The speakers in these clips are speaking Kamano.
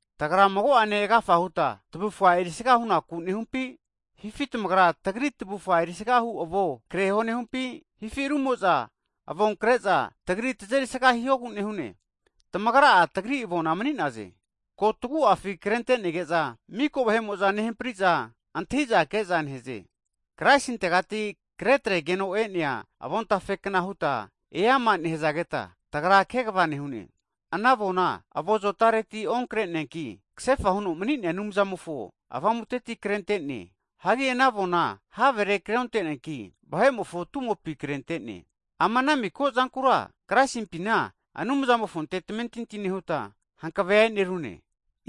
Tagra mago'ane agafa huta tavufga erisaga hunaku nehumpi? Hifi tamagra, tagri tavufa erisagahu avo kreho nehumpi, hifi rumo'za avon kre'za tagri husga hihogu nehune? Tamagra'a tagri avona mani'naze. Ko tagu'afi krentenege'za miko vahe'mo'za nehampriza antahiza ke'za nehaze. Kraisintegati kretregeno e'nea avontafe kna huta eama nehazageta, tagra kegva nehune. Ana avona avo zotaretira onkre'neanki, kasefa huno mani'nea Anumzamofo Avamuteti krente'ne. Hagi ana avona havere kreonte'neanki, vahe'mofo tumopi krentene. Ama ana miko zankura Kraisimpina, Anumzamofonte tamentinti nehuta hankave e'nerune.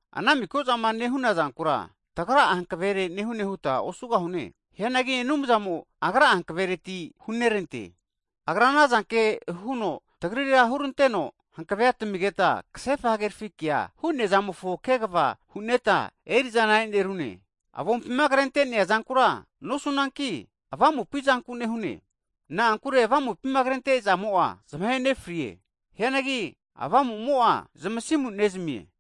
Ana miko zama nehuna zankura, tagra'a hankavere nehune huta osugahune. Hianagi Anumzamo agra'a hankavereti hunerante. Agra anazanke huno tagrira huranteno hankave tamigeta kasefa hagerafi kea hu'nea zamofo kegva hu'neta erizana e'nerune. Avompima krentenea zankura nosunanki, avamupi zanku nehune. Na'ankure Avompima krente zamo'a zamahe nefrie. Hianagi avamumo'a, zmasimu nezamie.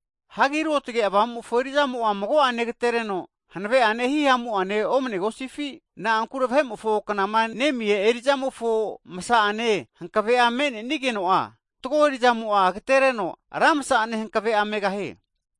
Hagi Ruotge Avamumofo erizamo'a mago'ane agatereno hanave'ane hihamua omanegosifi? Na'ankure vahe'mofoma knama nemia erizamofo msa'ane hankave'a me'nenigeno'a, fatgo erizamo'a agetereno ra msa'ane hankave'a megahie.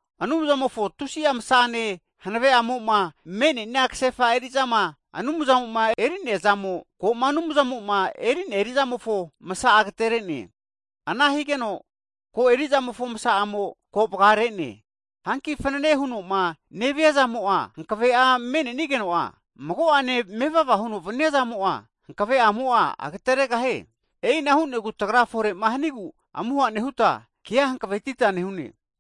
Anumzamofo tusi'a msa'ne hanave'amoma me'neana kasefa erizama Anumzamo'ma erinea zamo, koma Anumzamoma eri'nea erizamofo msa'a agaterene. Ana higeno ko erizamofo msa'mo'a ko vgarene. Hanki fanane hunoma nevania zamo'a hankave'a me'nenigeno'a, mago'ane mevava huno vania zamo'a, hankavemo'a agateregahie. E'ina hu'negu tagra fore'ma hanigu amuha nehuta, kea hankavetita nehune.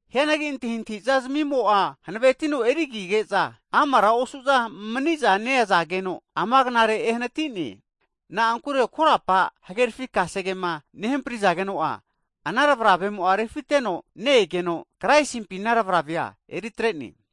Hianagi antahintahiza zmimo'a hanavetino antro higeza maniza neazageno, ama knare ehanatine. Na'ankure korapa huhagerafi kasegema nehamprizageno'a, ana tavravemo'a refiteno ne-egeno, Kraisimpi ana tavravea eritrene.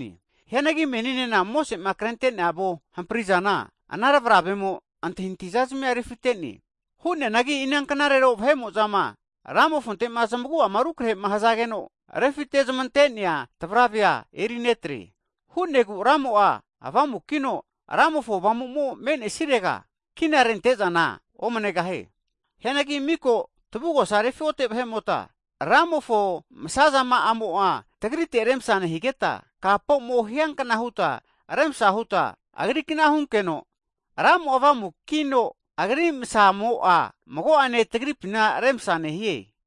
Hianagi meninena Mosese'ma krente'nea avo hamprizana, ana tavravemo antahintahizazmia refite'ne. Hu'neanagi vahe'mozama Ramofontema zmagu'ama rukrehema hzageno, refimatezmantenea tavravea erinetre. Ana hu'negu Ramo'a Avamukino, Ramofo Avamuma me'nesirega, kinarente'zana omanegahie. Hianagi miko tavugosa refi'ote vahe'mota, Ramofo msazama'amo'a tagrite remsa nehigeta, kapomo hiankna huta remsa huta Agri'kna hunkeno, Ramo'a avamukino, agri msazamo'a mago'ane tagripina remsa nehie.